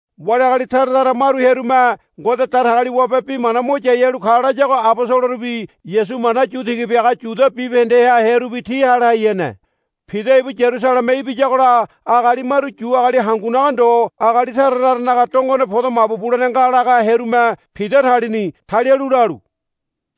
Wali agali tara tara maru hearume Ngode Datagaliwabe bi mana mo yai halu ka layago abosolorubi Yasu mana yu tiga biaga Yudia bibahendeha hearubi ti hale hai hene. Pida ibu Yarusaleme ibiyagola agali maru Yu agali hangunaga ndo agali tara taranaga dongone podo mabu bulene nga laga hearume Pida talini. Talialu lalu,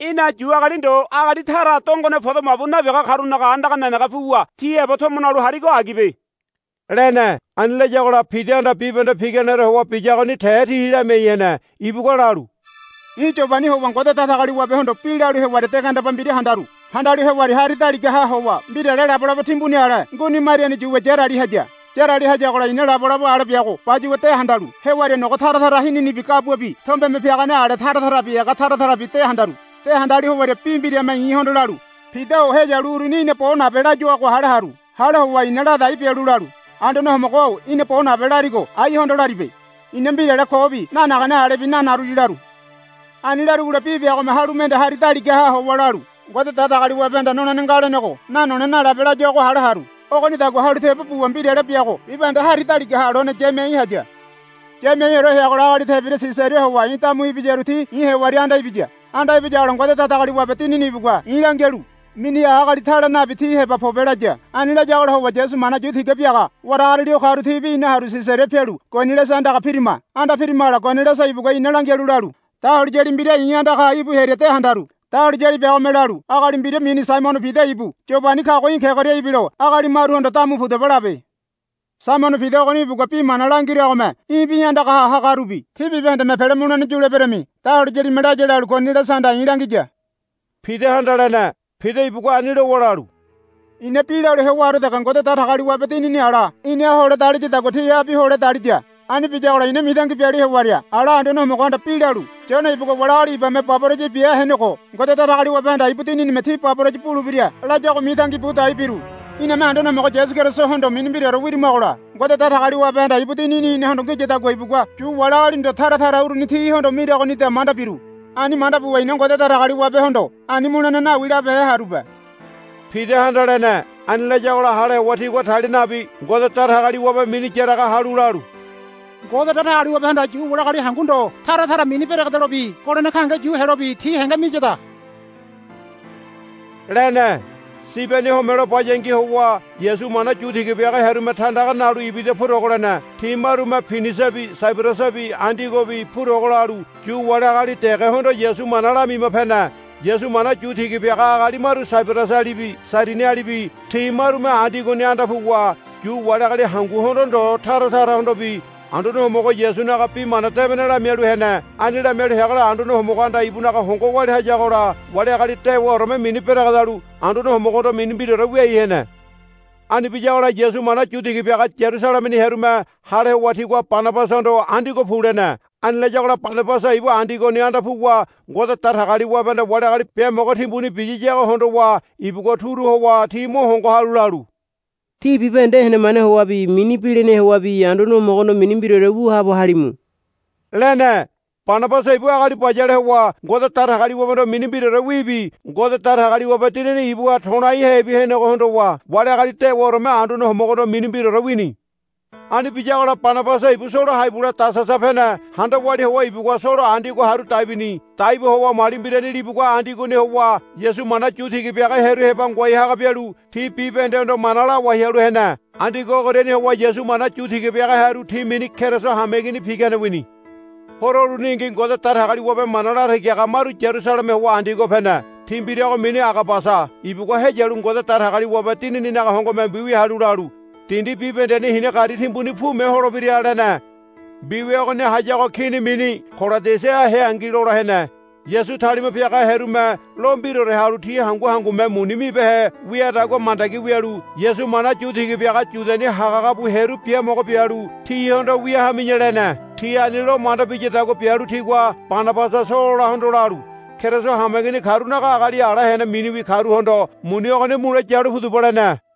Í̠na Yu agali ndo agali tara dongone podo mabu nabiaga karunaga andaga nenege puwa ti heba tomo nalu harigo agibe, lene. Ani layagola Pidahanda bibahende piganeore howa biyagoni te ti lamiai hene. Ibugua lalu, I̱ Yobani howa Ngode Datagaliwabehondo bi lalu hewaria de gandeba mbira handaru. Handalu hewaria hari daligaha howa mbirale labolabo timbuni ale nguini mariani yuwa yarali haya. Yarali hayagola i̱na labolabo ale biago bayuwa de handalu hewaria nogo tara tara hininibi gabuabi tombeme piagane ale tara tarabi ega tara tarabi de handaru. De handalu hewaria bi mbirame i̱hondo lalu, Pida-o heyalu uruni í̠na bo nabe, layuago hale haru. Hale howa i̱na ladai bialu lalu, Anduane Homogo-o í̠na bo nabe larigo aihondo laribe. I̱na mbirale kobi nanagane alebi nanaruli, laru. Ani larugola bi biagome halu mende hari daligaha howa lalu, Ngode Datagaliwabehanda nolene nga lenego nanole nalabe, layuago hale haru. Ogonidagua halu tebo buwa mbirale biago bibahende hari daligaha lone yamiai haya. Yamiaiore heagola agali tebira Sisaria howa i̱ damu ibiyaru ti i̱ hewaria anda ibiya. Anda ibiyagola Ngode Datagaliwabe Dinini ibugua i̱ langialu, Miniha agali tale nabi ti heba pobe, laya. Ani layagola howa Yasu mana yu tiga biaga waragariali o karu tibi ina haru Sisaria pialu Koniliasa andaga pirima. Anda pirimagola Koniliasa ibugua ina langialu lalu, Dahuliyali mbira i̱ andagaha íbu hearia de handaru. Dahuliyali biagome lalu, Agali mbira mini Saimono Pida ibu Yobani kago í̠ kegoria ibilo agali maruhondo, Damu pudaba, labe. Saimono Pida ogoni ibugua bi mana langiragome í̠bi í̠ andaga hagarubi tí bibahendeme pele mulene yuleberami, dahuliyalime laya lalu Koniliasahanda i̱ langiya, Pidahanda lene. Pida ibugua ani lowa lalu, I̱na bi lalu hewaore dege Ngode Datagaliwabe Dinini ala inaha hole daliyadagua tihabi hole daliya. Ani biyagola i̱na mitangi bialu hewaria ala Anduane Homogohanda bi lalu, Yone ibugua wali agali ibame baboraya bia henego Ngode Datagaliwabehanda ibu Dininime tí baboraya bulebira, layago mitangi budai biru. Iname Anduane Homogo Yasu Kerisohondo mini mbiraore wirimagola Ngode Datagaliwabehanda ibu Dinini inahondo ngiyadagua ibugua Yu wali agali ndo tara tara uruni tihondo miragonida manda biru. Ani manda buwa i̱na Ngode Datagaliwabehondo, Ani mulene nawi, labehe harube, Pidahanda lene. Ani layagola hale howa tigua talia nabi Ngode Datagaliwabe mini yaraga halu lalu, Ngode Datagaliwabehanda Yu wali agali hangu ndo tara tara mini beregedelobi holene gahenge yu helobi ti henge miyada, lene. Sibeni homelo bayangi howa Yasu mana yu tiga biaga hearume tandaga nalu ibida purogo lene. Ti marume Pinisiabi Saibarasabi Andiogobi purogo lalu Yu wali agali degehondo Yasu mana lamima pene. Yasu mana yu tiga biaga agali maru Saibarasalibi Sairinialibi ti marume Andiogoni anda puwa Yu wali agali hanguhondo ndo tara tarahondobi Anduane Homogo Yasunaga Bi Mana Debene lamialu hene. Ani lamialu heagola Anduane Homogohanda ibunaga hongo walia hayagola wali agali dewaoreme mini beregedalu Anduane Homogohondo mini mbiraore wiai hene. Ani biyagola Yasu mana yu tiga biaga Yarusalemeni hearume hale howa tigua Banabasahondo, Andiogo pu, lene. Ani layagola Banabasa ibu Andiogoni anda puwa Ngode Datagaliwabehanda wali agali biamogo timbuni biyiyago hondowa ibugua turu howa ti mo hongo halu lalu, Tí bibahende henemane howabi mini bilinahe howabi Anduane Homogohondo mini mbiraore wu haabo halimu, lene. Banabasa ibu agali bayale howa Ngode Datagaliwabehondo mini mbiraorewibi Ngode Datagaliwabe Dinini ibuha to̱laihebi henego hondowa wali agali dewaoreme Anduane Homogohondo mini mbiraore wini. Ani biyagola Banabasa ibu Solo hai bule Tasasa pene. Handa walia howa ibugua Solo Andiogo haru dai bini. Dai bu howa mali mbirani libugua Andiogoni howa Yasu mana yu tiga biaga hearu heba ngoai haga bialu ti bibahendehondo mana lawai halu hene. Andiogo ogoriani howa Yasu mana yu tiga biaga hearu ti mini Keriso hameigini pigane wini. Horo uruningi Ngode Datagaliwabe mana latagi haga maru Yarusaleme howa Andiogo pene. Ti mbirago mini Agabasa ibugua heyalu Ngode Datagaliwabe Dinininaga hongome mbiwia halu lalu, Dindi bibahendeni hina gari timbuni pume holebira, lene. Mbiwia ogoni hayago kini mini Kolodiasa heangi lola hene. Yasu talima piaga hearume lo mbiraore halu ti hangu hangume muni mibehe wiadagua mandagi wialu Yasu mana yu tiga biaga Yudiani hagahaga bu hearu biamogo bialu, Tihondo wia hami̱ya, lene. Ti ani lo manda biyadagua bialu tigua Banabasa Sololahondo lalu, Keriso hameigini karunaga agali ala hene miniwi karuhondo muni ogoni mule yalu pudaba, lene.